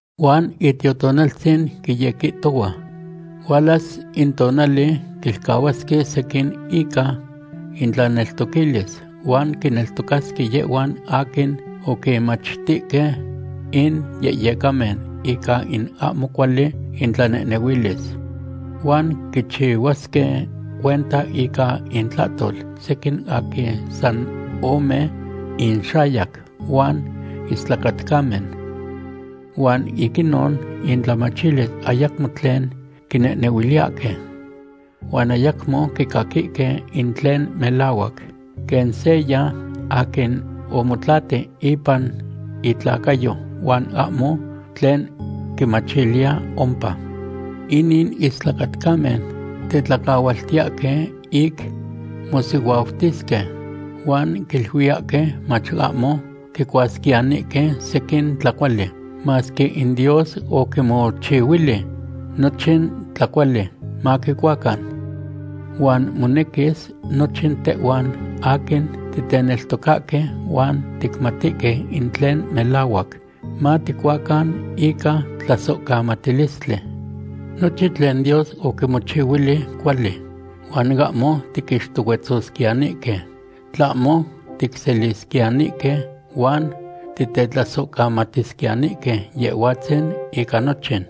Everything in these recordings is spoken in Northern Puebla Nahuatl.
Huan Itiotonaltzin quiyequihtohua hualas in tonali quilcahuasque sequin ica intlaneltoquilis huan quineltocasque yehhuan aquin oquinmachtihque in yehyecamen ica in ahmo cuali itlanehnehuilis. Huan quichihuasque cuenta ica intlahtol sequin aquin san ome inxayac huan istlacatcamen. Huan ic inon intlamachilis ayacmo tlen quinehnehuiliyahque. Huan ayacmo quicaquihque in tlen melahuac, quen seya aquin omotlati ipan itlacayo huan ahmo tlen quimachiliya ompa. Inin istlacatcamen tetlacahualtiyahque ic mosihuautisque huan quiluiyahque mach ahmo quicuasquiyanihque sequin tlacuali, masque in Dios oquimochihuili nochin tlacuali maquicuacan. Huan monequis nochin tehhuan aquin titeneltocahque huan ticmatihque in tlen melahuac, maticuacan ica tlasohcamatilistli. Nochin tlen Dios oquimochihuili cuali, huan ahmo tiquixtohuetzosquiyanihque, tlahmo ticselisquiyanihque huan titetlasohcamatisquiyanihque Yehhuatzin ica nochin.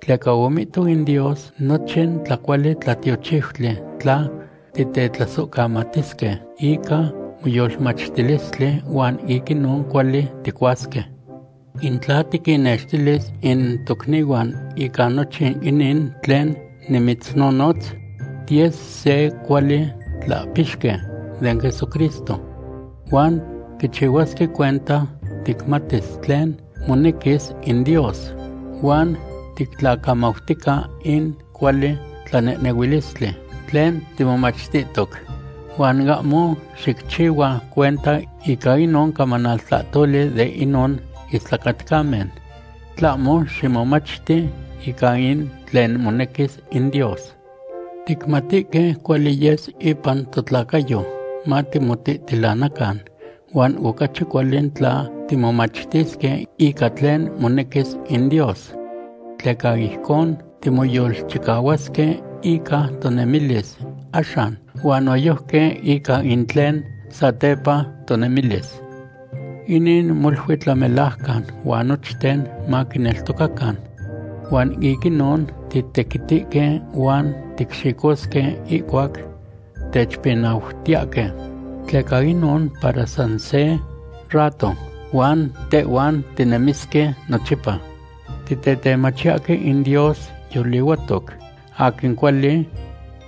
Tleca omihto in Dios nochin tlacuali tlatiochiutli tla titetlasohcamatisque ica moyolmachtilistli huan ic inon cuali ticuasque. In tla tiquinnextilis in tocnihuan ica nochin inin tlen nimitznonotz, tiyes se cuali tlahpixqui den Jesucristo. Huan quichihuasque cuenta ticmatis tlen monequis in Dios huan tictlacamautica in cuali tlanehnehuilistli tlen timomachtihtoc. Huan ahmo xicchihua cuenta ica inon camanaltlahtoli de inon istlacatcamen, tlahmo ximomachti ica in tlen monequis in Dios. Ticmatihque cuali yes ipan totlacayo matimotihtilanacan, huan ocachi cuali tla timomachtisque ica tlen monequis in Dios. Tleca ijcon timoyolchicahuasque ica tonemilis axan huan noyojqui ica in tlen satepa tonemilis. Inin molui tlamelajcan huan nochten maquineltocacan. Huan ic inon titequitihque huan ticxicosque ihcuac techpinautiyahque, tleca inon para san se rato, huan tehhuan tinemisque nochipa. Titetemachiyahque in Dios yolihuatoc aquin cuali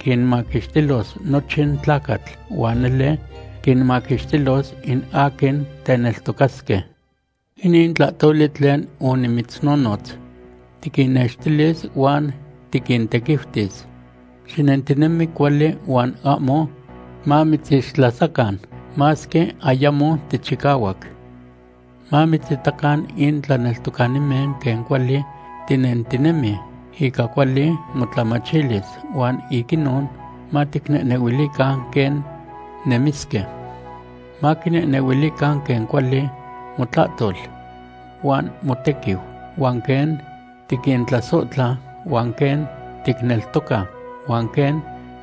quinmaquixtilos nochin tlacatl huan nele quinmaquixtilos in aquin teneltocasque. Inin tlahtoli tlen onimitznonotz tiquinnextilis huan tiquintequiutis. Xinentinemi cuali huan ahmo mamitzixtlasacan, masque ayamo tichicahuac. Mamitzitacan in tlaneltocanimen quen cuali tinentinemi ica cuali motlamachilis huan ic inon maquinehnehuilican quen nemisque. Maquinehnehuilican quen cuali motlahtol huan motequiu, huan quen tiquintlasohtla, huan quen ticneltoca, huan quen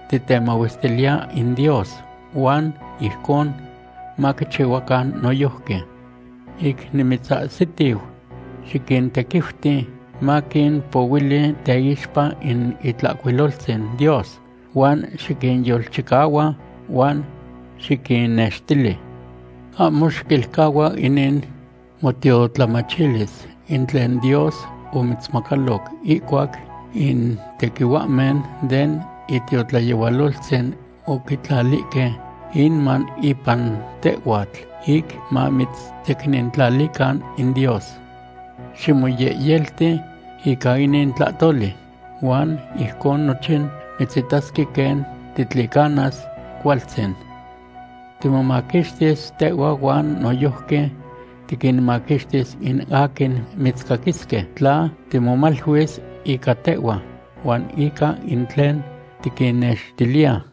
titemahuestiliya in Dios, huan ijcon maquichihuacan noyojqui. Ic nimitzahsitiu, xiquintequiuti maquimpohuili teixpa in Itlahcuiloltzin Dios, huan xiquinyolchicahua huan xiquinnextili. Ahmo xiquilcahua inin motiotlamachilis in tlen Dios omitzmacaloc ihcuac in tequihuahmen den itiotlayehualoltzin oquitlalihque inman ipan tehhuatl ic mamitzsecnintlalican in Dios. Ximoyehyelti ica inin tlahtoli, huan ijcon nochin mitzitasque quen titlicanas cualtzin. Timomaquixtis tehhua huan noyojqui tiquinmaquixtis in aquin mitzcaquisque tla timomaluis ica tehhua huan ica in tlen tiquinnextiliya.